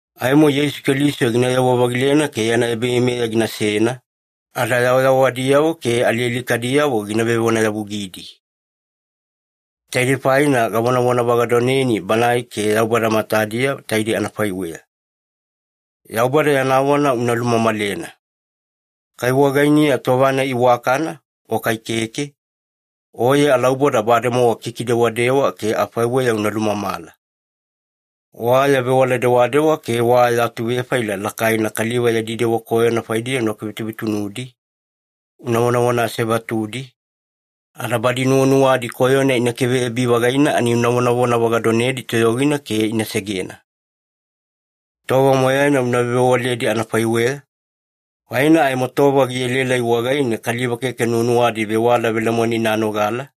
Aimo Yeisu Keliso ginayewa-vagilena ke yana ebaveimeya ginasena, ada yawayawadiyavo ke alialikadiyavo gina vevonayavugidi. Taidei faina gavonavonavagadoneni Banae ke Yaubada matadiya taidei anafaiweya. Yaubada yana vona una lulumamalena. Kai wagainiya tova-nai iwakana o kai keke, oye alauboda bademowa kikidewadewa ke afaiweya una lumamala. Wa ya vewala dewadewa ke wa ya atuvefaila lakaina kaliva yadi dewa koyona faidiya una kivetuvetunudi, una vonavona asevatudi, ada badi nuwanuwadi koyona ina kiveyabi-vagaina ani una vonavona vagadonedi toyogina ke ina segena. Tova moyaina una vewavewaledi anafaiweya, faina aimo tova gielaelai wagaine kaliva keke nuwanuwadi vewala velemoena ina nogala,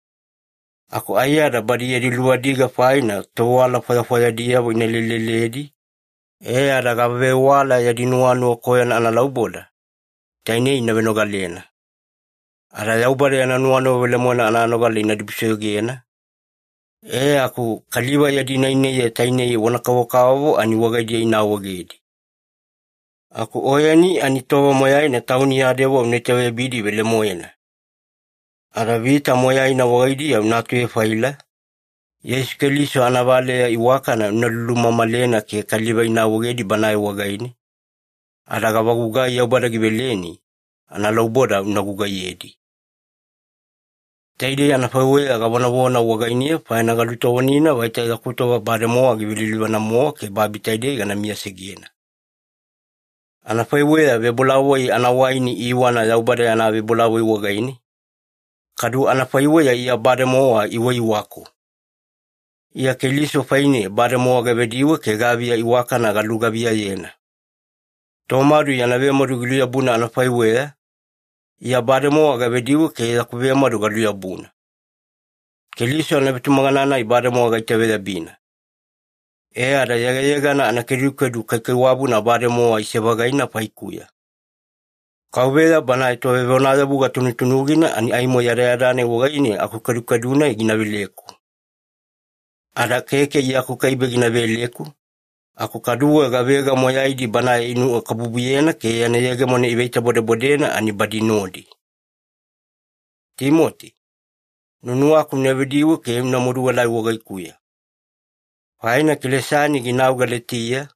aku aiyada badi yadi luvadiga faina tovewala fwayafwayadiyavo ina leleledi e ada gavavewala yadi nuwanuwa koyona analauboda, tainei ina venogalena. Ada Yaubada yana nuwanuwa velemoena ananogala ina dibusoyogena, e aku kaliva yadi nainaiya tainei vona kavokavovo ani wagaidiya ina awaegedi. Aku oyeni ani tova moyaina tauni ya dewa una itaveyabidi velemoena. Ada vita moyaina wagaidiya una atuvefaila, Yeisu Keliso anavaleya iwakana una lulumamalena ke kaliva ina awaegedi Banae wagaine, ada gavagugai Yaubada giveleni, analauboda una gugaiyedi. Taidei anafaiweya gavonavona wagainiya faina galutovonina vaita yaku tova bademowa givelilivana-mowa ke babi taidei gana miyasegena. Anafaiweya vebolavoi anawaini iiwana Yaubada yana vebolavoi wagaine, kadu anafaiweya Iya bademowa iiwaiwaku. Iya Keliso faine bademowa gavediwe ke gaviya iwakana galugaviyayena. Tomadu yana vemadu giluyabuna anafaiweya, Iya bademowa gavediwe ke yaku vemadu galuyabuna. Keliso anavetumagana-nai bademowa gaitaveyabina. E ada yegayegana anakedukedu kaikaiwabuna bademowa ise-vagaina faikuya. Kauveya Banae Tovevonayavuga tunutunugina ani aimo yadayada-nai wagaine akukedukedu-nai gina veleku. Ada keke Iya akukaibe gina veleku, aku kaduwe gavega moyaidi Banae inuwakabubuyena ke yana yegemona iveitabodabodena ani badi nodi. Timoti, nuwanuwaku una vediwe ke una maduelai wagaikuya. Faina Kelesani ginau Galetiya,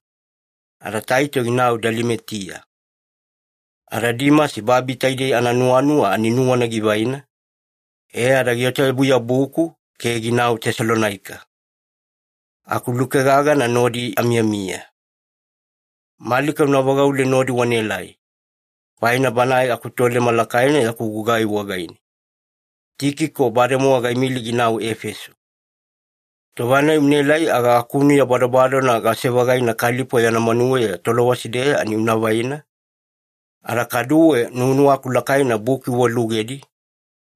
ada Taito ginau Dalimatiya. Ada Dimasi babi taidei ananuwanuwa ani nuwana givaina, e ada giota-yabuyabuku ke ginau Tesalonaika. Aku Luke gagana nodi amiyamiya. Malika una vagaule nodi wanaelai, faina banae akutoleme lakaina yaku gugai wagaine. Tikiko bademowa gaimili ginau Efeso. Tova-nai unaelai aga akunuya badobadona gase-vagaina Kalipo yana manuweya Tolowasi-deya ani una vaina, ada kaduwe nuwanuwaku lakaina buki uwalugedi,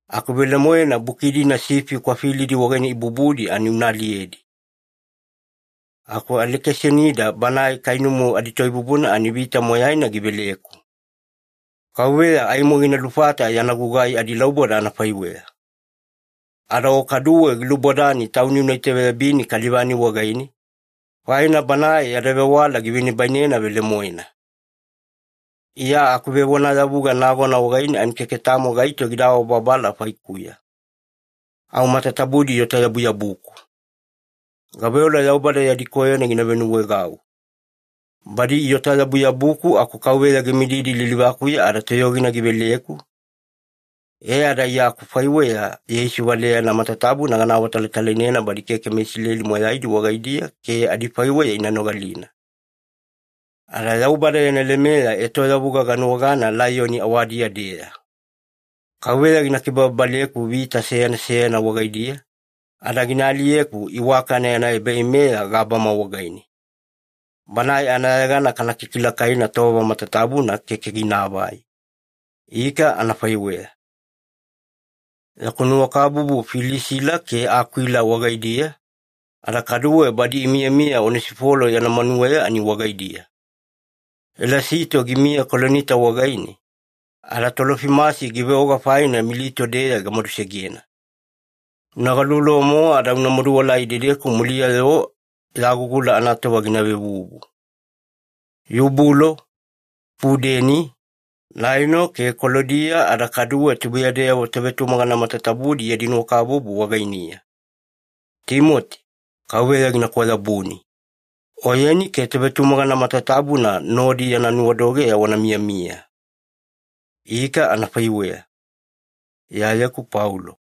aku velemoena buki-dina sifi kwafilidi wagaine ibubudi ani una aliyedi. Aku Alekisanida banae kainumu aditoibubuna ani vita moyaina giveleku. Kauveya aimo gina lufata yana gugai adilauboda anafaiweya. Ada o kaduwe gilubodani tauni una itaveyabini kaliva-nai wagaine, faina banae yada vewala givenibainena velemoena. Iya akuvevonayavuga nagona wagaine ani keke tamo gaito gida awabababala faikuya. Au matatabudi iota-yabuyabuku. Gaveola Yaubada yadi koyona gina venuwaegau. Badi iota-yabuyabuku aku Kauveya gimididi lilivakuya ada toyogina giveleku, e ada Iya akufaiweya Yeisu valeyana matatabuna gana awatalatalainena badi keke meIsileli moyaidi wagaidiya ke adifaiweya ina nogalina. Ada Yaubada yana lemeya etoyavuga ganuwagana laiyoni awadiya-deya. Kauveya gina kibababaleku vita seyana seyana wagaidiya, ada gina aliyeku iwakana yana ebaveimeya gabama wagaine. Banae anayegana kana kikilakaina tova matatabuna keke ginaavai. Ika, anafaiweya. Yaku nuwakabubu Filisila ke Akwila wagaidiya, ada kaduwe badi imiyamiya Onesifolo yana manuweya ani wagaidiya. Elasito gimiya Kolinita wagaine, ada Tolofimasi giveoga faina Milito-deya gamadusegena. Una galuvaluva-mowa ada una maduelai idedeku muliya-yo yagugula anatova gina vevuvu. Yubulo, Pudeni, Laino ke Kalodiya ada kaduwe tubuiyadeyavo tovetumagana matatabudi yadi nuwakabubu wagainiya. Timoti, Kauveya gina kwayabuni. Oyeni ke tovetumagana matatabuna nodi yana nuwadogeya wana miyamiya. Ika, anafaiweya. Iyayeku Paulo